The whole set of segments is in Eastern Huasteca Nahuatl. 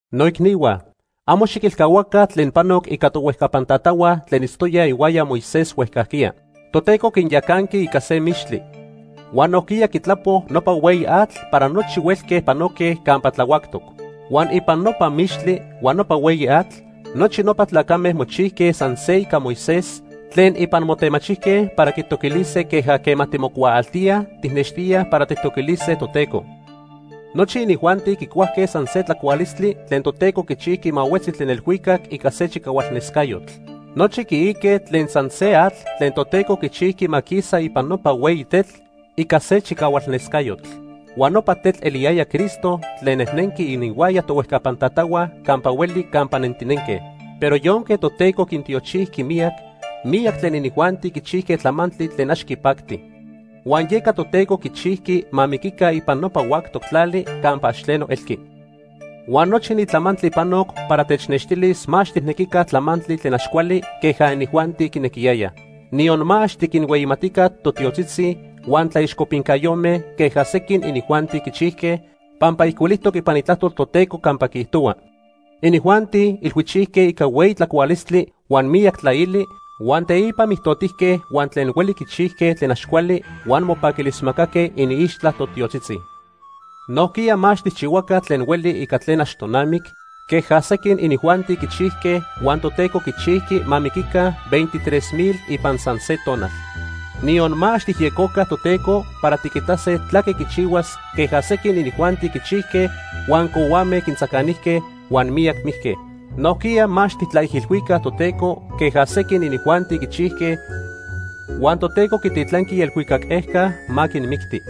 Noicnihua, amo xiquilcahuaca tlen panoc ica tohuejcapan tatahua tlen itztoyaj ihuaya Moisés huejcajquiya. Toteco quinyacanqui ica se mixtli. Huan nojquiya quitlapo nopa hueyi atl para nochi huelque panoque campa tlahuactoc. Huan ipan nopa mixtli huan nopa hueyi atl, nochi nopa tlacame mochijque san se ica Moisés tlen ipan motemachijque para quitoquilise queja quema timocuaaltíaj tijnextíaj para tijtoquilise Toteco. Nochi inijuanti quicuajque san se tlacualistli tlen Toteco quichijqui ma huetzi tlen elhuicac ica se chicahualnescayotl. Nochi quiique tlen san se atl tlen Toteco quichijqui ma quisa ipan nopa hueyi tetl ica se chicahualnescayotl. Huan nopa tetl eliyaya Cristo tlen nejnenqui ininhuaya tohuejcapan tatahua campa hueli campa nentinenque. Pero yonque Toteco quintiochijqui miyac, miyac tlen inijuanti quichijque tlamantli tlen ax quipacti. Huan yeca Toteco quichijqui ma miquica ipan nopa huactoc tlali campa ax tleno elqui. Huan nochi ni tlamantli panoc para technextilis ma ax tijnequica tlamantli tlen ax cuali queja inijuanti quinequiyayaj. Niyon ma ax tiquinhueyimatica totiotzitzi huan tlaixcopincayome queja sequin inijuanti quichijque, pampa ijcuilijtoc ipan Itlajtol Toteco campa quiijtohua: “Inijuanti ilhuichijque ica hueyi tlacualistli huan miyac tlaili, huan teipa mijtotijque huan tlen hueli quichijque tlen ax cuali huan mopaquilismacaque iniixtla totiotzitzi.” Nojquiya ma ax tijchihuaca tlen hueli ica tlen ax tonamic queja sequin inijuanti quichijque huan Toteco quichijqui ma miquica veintitres mil ipan san se tonal. Niyon ma ax tijyejcoca Toteco para tiquitase tlaque quichihuas queja sequin inijuanti quichijque huan cohuame quintzacanijque huan miyac mijque. Nojquiya ma ax tijtlaijilhuica Toteco queja sequin inijuanti quichijque huan Toteco quititlanqui ielhuicac ejca ma quinmicti.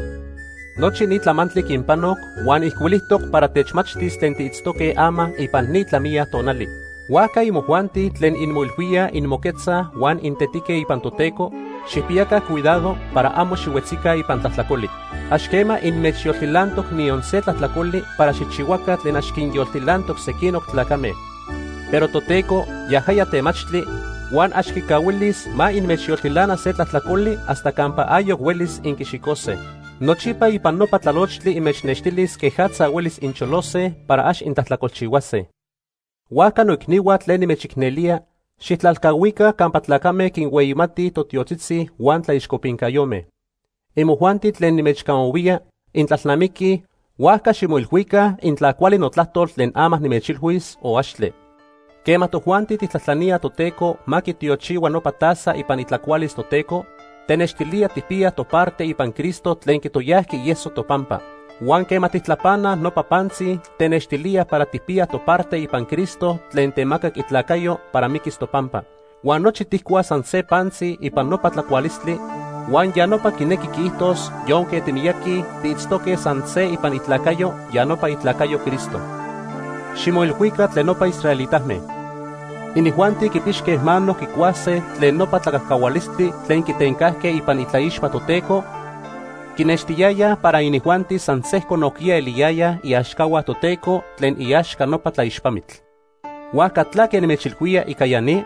Nochi ni tlamantli quinpanoc huan ijcuilijtoc para techmachtis tlen tiitztoque ama ipan ni tlamiya tonali. Huajca imojuanti tlen inmoilhuíaj inmoquetzaj huan intetique ipan Toteco, xijpiyaca cuidado para amo xihuetzica ipan tlajtlacoli. Ax quema inmechyoltilantoc niyon se tlajtlacoli para xijchihuaca tlen ax quinyoltilantoc sequinoc tlacame. Pero Toteco, yajaya temachtli, huan ax quicahuilis ma inmechyoltilana se tlajtlacoli hasta campa ayoc huelis inquixicose. Nochipa ipan nopa tlalochtli inmechnextilis quejatza huelis incholose para ax intlajtlacolchihuase. Huajca noicnihua tlen nimechicnelía, xijtlalcahuica campa tlacame quinhueyimatij totiotzitzi huan tlaixcopincayome. Inmojuanti tlen nimechcamahuía, intlalnamiquij, huajca ximoilhuica intla cuali notlajtol tlen ama nimechilhuis o axtle. Quema tojuanti tijtlajtlaníaj Toteco ma quitiochihua nopa taza ipan itlacualis Toteco, tenextilía tijpiyaj toparte ipan Cristo tlen quitoyajqui ieso topampa. Huan quema tijtlapanaj nopa pantzi, tenextilíaj para tijpiyaj toparte ipan Cristo tlen temacac itlacayo para miquis topampa. Huan nochi tijcuaj san se pantzi ipan nopa tlacualistli huan ya nopa quinequi quiijtos yonque timiyaqui, tiitztoque san se ipan itlacayo, ya nopa itlacayo Cristo. Ximoilhuica tlen nopa israelitame. Inijuanti quipixque mano quicuase tlen nopa tlacajcahualistli tlen quitencajque ipan itlaixpa Toteco, quinextiyayaj para inijuanti san sejco nojquiya eliyayaj iaxcahua Toteco tlen iaxca nopa tlaixpamitl. ¿Huajca tlaque nimechilhuía ica ya ni?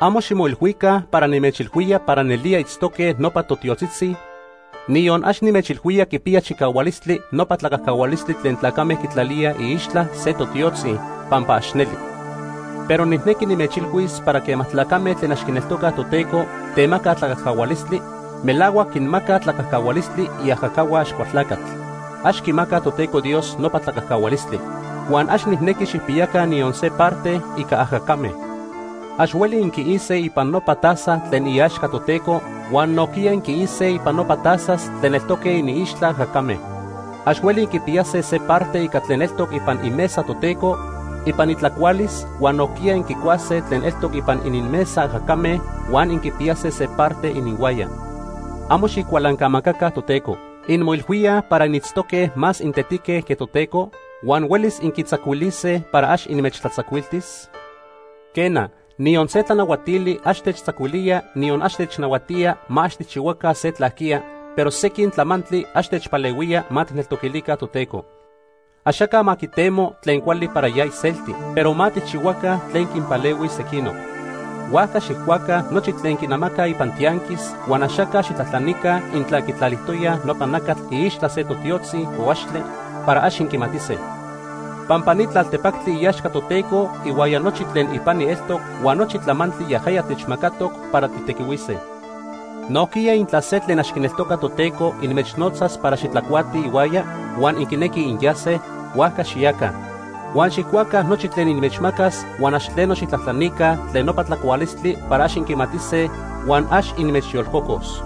Amo ximoilhuica para nimechilhuía para nelía itztoque nopa totiotzitzi, niyon ax nimechilhuía quipiya chicahualistli nopa tlacajcahualistli tlen tlacame quitlalíaj iixtla se totiotzi, pampa ax neli. Pero nijnequi nimechilhuis para quema tlacame tlen ax quineltocaj Toteco temacaj tlacajcahualistli, melahuac quinmacaj tlacajcahualistli iajacahua Axcualtlacatl. Ax quimacaj Toteco Dios nopa tlacajcahualistli. Huan ax nijnequi xijpiyaca niyon se parte ica ajacame. Ax hueli inquiise ipan nopa taza tlen iaxca Toteco huan nojquiya inquiise ipan nopa tazas tlen eltoque iniixtla ajacame. Ax hueli inquipiyase se parte ica tlen eltoc ipan imesa Toteco ipan itlacualis huan nojquiya inquicuase tlen eltoc ipan ininmesa ajacame huan inquipiyase se parte ininhuaya. Amo xijcualancamacaca Toteco. ¿Inmoilhuíaj para initztoque más intetique que Toteco huan huelis inquitzacuilise para ax inmechtlatzacuiltis? Quena, niyon se tlanahuatili ax techtzacuilía niyon ax technahuatía ma ax tijchihuaca se tlajquiya, pero sequin tlamantli ax techpalehuía ma tijneltoquilica Toteco. Axaca ma quitemo tlen cuali para ya iselti, pero ma tijchihuaca tlen quinpalehuis sequinoc. Huajca xijcuaca nochi tlen quinamacaj ipan tianquis huan axaca xijtlajtlanica intla quitlalijtoyaj nopa nacatl iixtla se totiotzi o axtle, para ax inquimatise, pampa ni tlaltepactli iaxca Toteco ihuaya nochi tlen ipani eltoc huan nochi tlamantli yajaya techmacatoc para tijtequihuise. Nojquiya intla se tlen ax quineltoca Toteco inmechnotzas para xitlacuatij ihuaya huan inquinequij inyase, huajca xiyaca. Huan xijcuaca nochi tlen inmechmacas huan ax tleno xijtlajtlanica tlen nopa tlacualistli para ax inquimatise huan ax inmechyolcocos.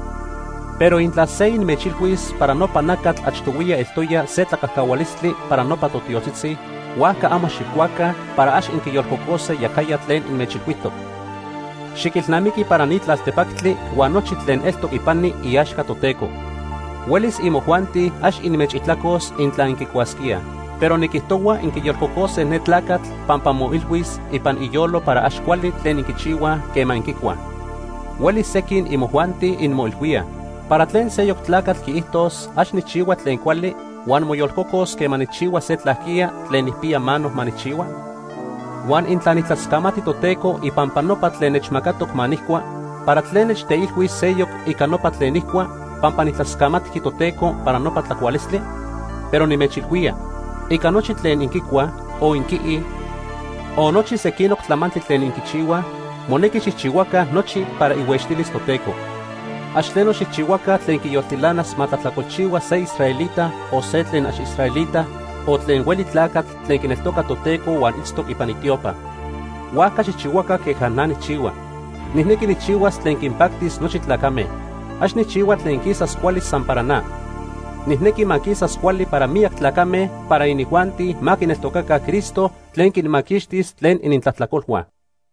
Pero intla se inmechilhuis para nopa nacatl achtohuiya eltoya se tlacajcahualistli para nopa totiotzitzi, huajca amo xijcuaca para ax inquiyolcocose yajaya tlen inmechilhuijtoc. Xiquilnamiqui para ni tlaltepactli huan nochi tlen eltoc ipani iaxca Toteco. Huelis imojuanti ax inmechijtlacos intla inquicuasquíaj, pero niquijtohua inquiyolcocose ne tlacatl pampa moilhuis ipan iyolo para ax cuali tlen inquichihuaj quema inquicuaj. Huelis sequin imojuanti inmoilhuíaj: “¿Para tlen seyoc tlacatl quiijtos ax nijchihua tlen cuali huan moyolcocos quema nijchihua se tlaquiya tlen nijpiya mano ma nijchihua? Huan intla nijtlascamati Toteco ipampa nopa tlen nechmacatoc ma nijcua, ¿para tlen nechteilhuis seyoc ica nopa tlen nijcua, pampa tijtlascamatqui Toteco para nopa tlacualistli?” Pero nimechilhuía, ica nochi tlen inquicuaj, o inquiij, o nochi sequinoc tlamantli tlen inquichihuaj, monequi xijchihuaca nochi para ihuextilis Toteco. Ax tleno xijchihuaca tlen quiyoltilanas ma tlajtlacolchihua se israelita, o se tlen ax israelita, o tlen hueli tlacatl tlen quineltoca Toteco huan itztoc ipan itiopa. Huajca xijchihuaca queja na nijchihua. Nijnequi nijchihuas tlen quinpactis nochi tlacame. Ax nijchihua tlen quisas cuali san para na. Nijnequi ma quisas cuali para miyac tlacame para inijuanti ma quineltocaca Cristo tlen quinmaquixtis tlen inintlajtlacolhua.